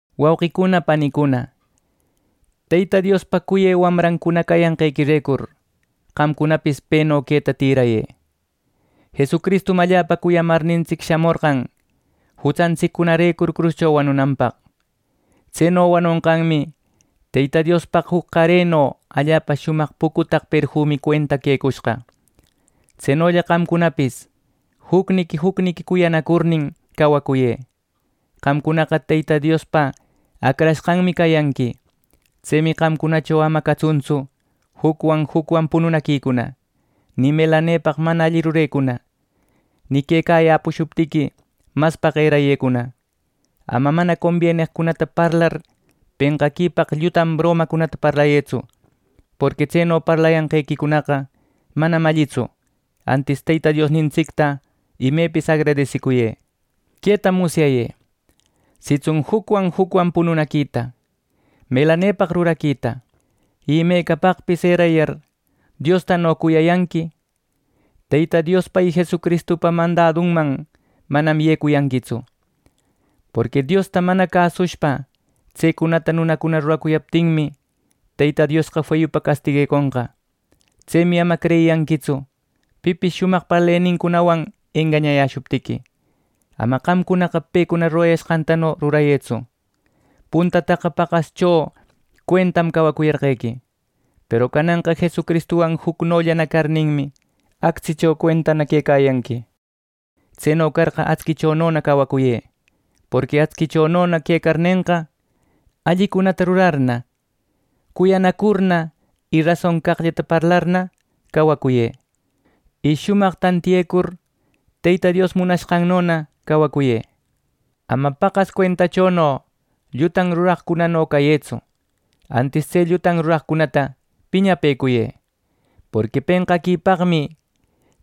Wauqicuna panicuna, Teyta Diospa cuyë wamrancuna cayanqequirecur qamcunapis peno queta tïrayë. Jesucristum allapa cuyamarnintsic shamorqan jutsantsiccunarecur cruscho wanunanpaq. Tseno wanonqanmi Teyta Diospaq juc qareno allapa shumaq pucutaq perfumi cuenta quecushqa. Tsenolla qamcunapis jucniqui jucniqui cuyanacurnin cawacuyë. Qamcunaqa Teyta Diospa acrashqanmi cayanqui. Tsemi qamcunacho ama catsuntsu jucwan jucwan pununaquicuna, ni melanepaq mana alli rurecuna, ni quecayäpushuptiqui maspaq erayecuna. Ama mana cabeqcunata parlar penqaquipaq llutan bromacunata parlayëtsu; porqui tseno parlayanqequicunaqa manam allitsu. Antis Teyta Diosnintsicta imepis agradesicuyë. Queta musyayë: sitsun jucwan jucwan pununaquita, melanepaq ruraquita, y imecapaqpis erayar Diostano cuyayanqui, Teyta Diospa y Jesucristupa mandadunman manam yecuyanquitsu. Porqui Diosta mana cäsushpa tsecunata nunacuna ruracuyaptinmi, Teyta Diosqa feyupa castigueconqa. Tsemi ama creyiyanquitsu pipis shumaq parlenincunawan engañayäshuptiqui. Ama qamcunaqa pecuna rurayashqantano rurayëtsu. Puntataqa paqascho cuentam cawacuyarqequi; peru cananqa Jesucristuwan jucnollana carninmi, actsicho cuentana quecayanqui. Tseno carqa, actsichonona cawacuyë. Porqui actsichonona quecarnenqa, allicunata rurarna, cuyanacurna y rason caqllata parlarna cawacuyë. Y shumaq tantiyecur Teyta Dios munashqannona cawacuyë. Ama paqas cuentachono llutan ruraqcunano cayëtsu, antis tse llutan ruraqcunata piñapëcuyë. Porqui penqaquipaqmi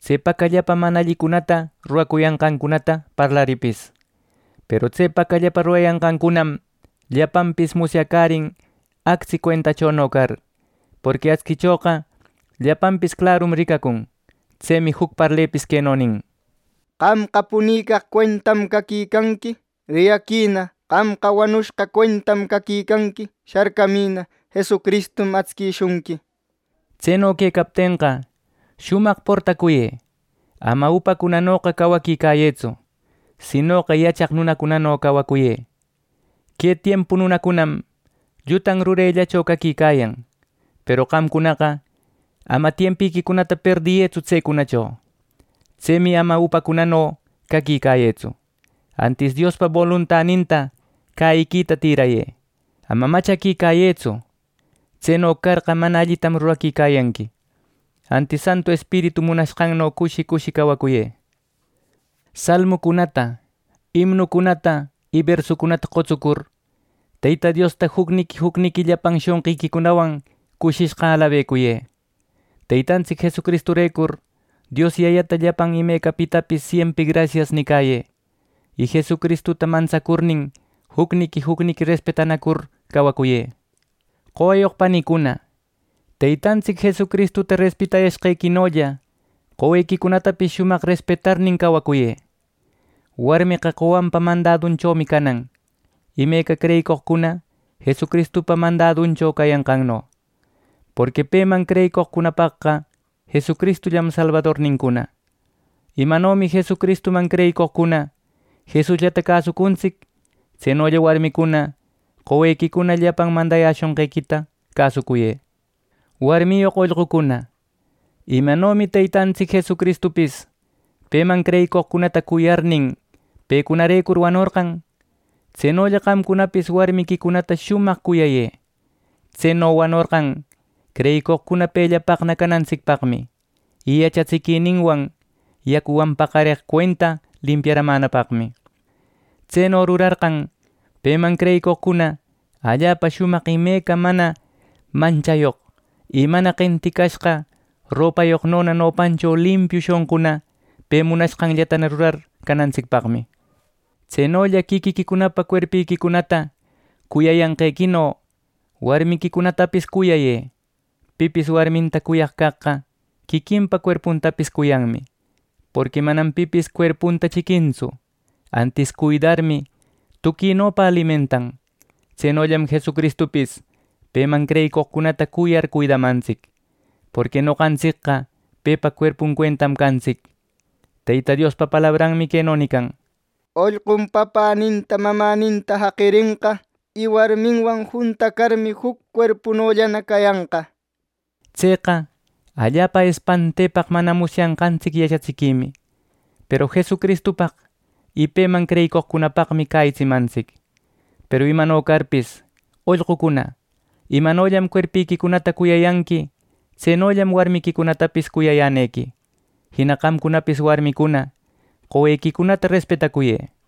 tse pacallapa mana allicunata rurayashqancunata parlarïpis. Peru tse pacallapa rurayashqancunam llapanpis musyacärin actsi cuentachono car. Porqui actsichoqa llapanpis clarum ricacun. Tsemi juc parlepis queno nin: “Qamqa punicaq cuentam caquicanqui. ¡Riyaquïna! Qamqa wanushqa cuentam caquicanqui. ¡Sharcamïna! Jesucristum actsishunqui” nir. Tseno quecaptenqa shumaq portacuyë. Ama upacunanoqa cawaquicayëtsu; sinoqa yachaq nunacunano cawacuyë. Que tiempu nunacunam llutan rurellacho caquicayan, peru qamcunaqa ama tiempiquicunata perdiyëtsu tsecunacho. Tsemi ama upacunano caquicayëtsu, antis Diospa boluntaninta cäyiquita tïrayë. Ama machaquicayëtsu; tseno carqa mana allitam rurecuyanqui. Antis Santu Espiritu munashqanno cushi cushi cawacuyë. Salmucunata, imnucunata y bersucunata qotsucur, Teyta Diosta jucniqui jucniqui llapan shonqiquicunawan cushishqa alabecuyë. Teytantsic Jesucristurecur Dios Yayata llapan imecapitapis siempri grasias nicayë. Y Jesucristuta mantsacurnin, jucniqui jucniqui respetanacur cawacuyë. Qowayoq panicuna, Teytantsic Jesucristuta respetayashqequinolla qowequicunatapis shumaq respetarnin cawacuyë. Warmeqa qowanpa mandadunchomi canan, imeca creyicoqcuna Jesucristupa mandaduncho cayanqanno. Porqui peman creyicoqcunapaqqa Jesucristullam Salbadornincuna. Imanomi Jesucristuman creyicoqcuna Jesusllata cäsucuntsic, tsenolla warmicuna qowequicuna llapan mandayäshonqequita cäsucuyë. Warmiyoq ollqucuna, imanomi Teytantsic Jesucristupis Peman creyicoqcunata cuyarnin pecunarecur wanorqan; tsenolla qamcunapis warmiquicunata shumaq cuyayë. Tseno wanorqan creyicoqcuna pellapaqna canantsicpaqmi y yachatsiquininwan yacuwan paqareq cuenta limpiaramänapaqmi. Tseno rurarqan peman creyicoqcuna allapa shumaq imeca mana manchayoq, y mana qenticashqa ropayoqnona nopancho limpiu shonquna, pe munashqanllatana rurar canantsicpaq. Tsenolla quiquiquicunapa cuerpiquicunata cuyanqequino warmiquicunatapis cuyayë. Pipis warminta cuyaq caqqa quiquinpa cuerpuntapis cuyanmi. Porqui manam pipis cuerpunta chiquintsu, antis cuidarmi tuquinopa alimentan. Tsenollam Jesucristupis peman creyicoqcunata cuyar cuidamantsic. Porqui noqantsicqa pepa cuerpun cuentam cantsic. ˻Teyta Diospa palabranmi queno nican˼: “Ollqum papäninta mamäninta jaqirenqa, y warminwan juntacarmi, juc cuerpunollana cayanqa” nir. Tseqa allapa espantepaq mana musyanqantsic yachatsiquimi, peru Jesucristupaq y peman creyicoqcunapaqmi cäyitsimantsic. Peru imano carpis ollqucuna, imanollam cuerpiquicunata cuyayanqui tsenollam warmiquicunatapis cuyayänequi. Jina qamcunapis warmicuna qowequicunata respetacuyë.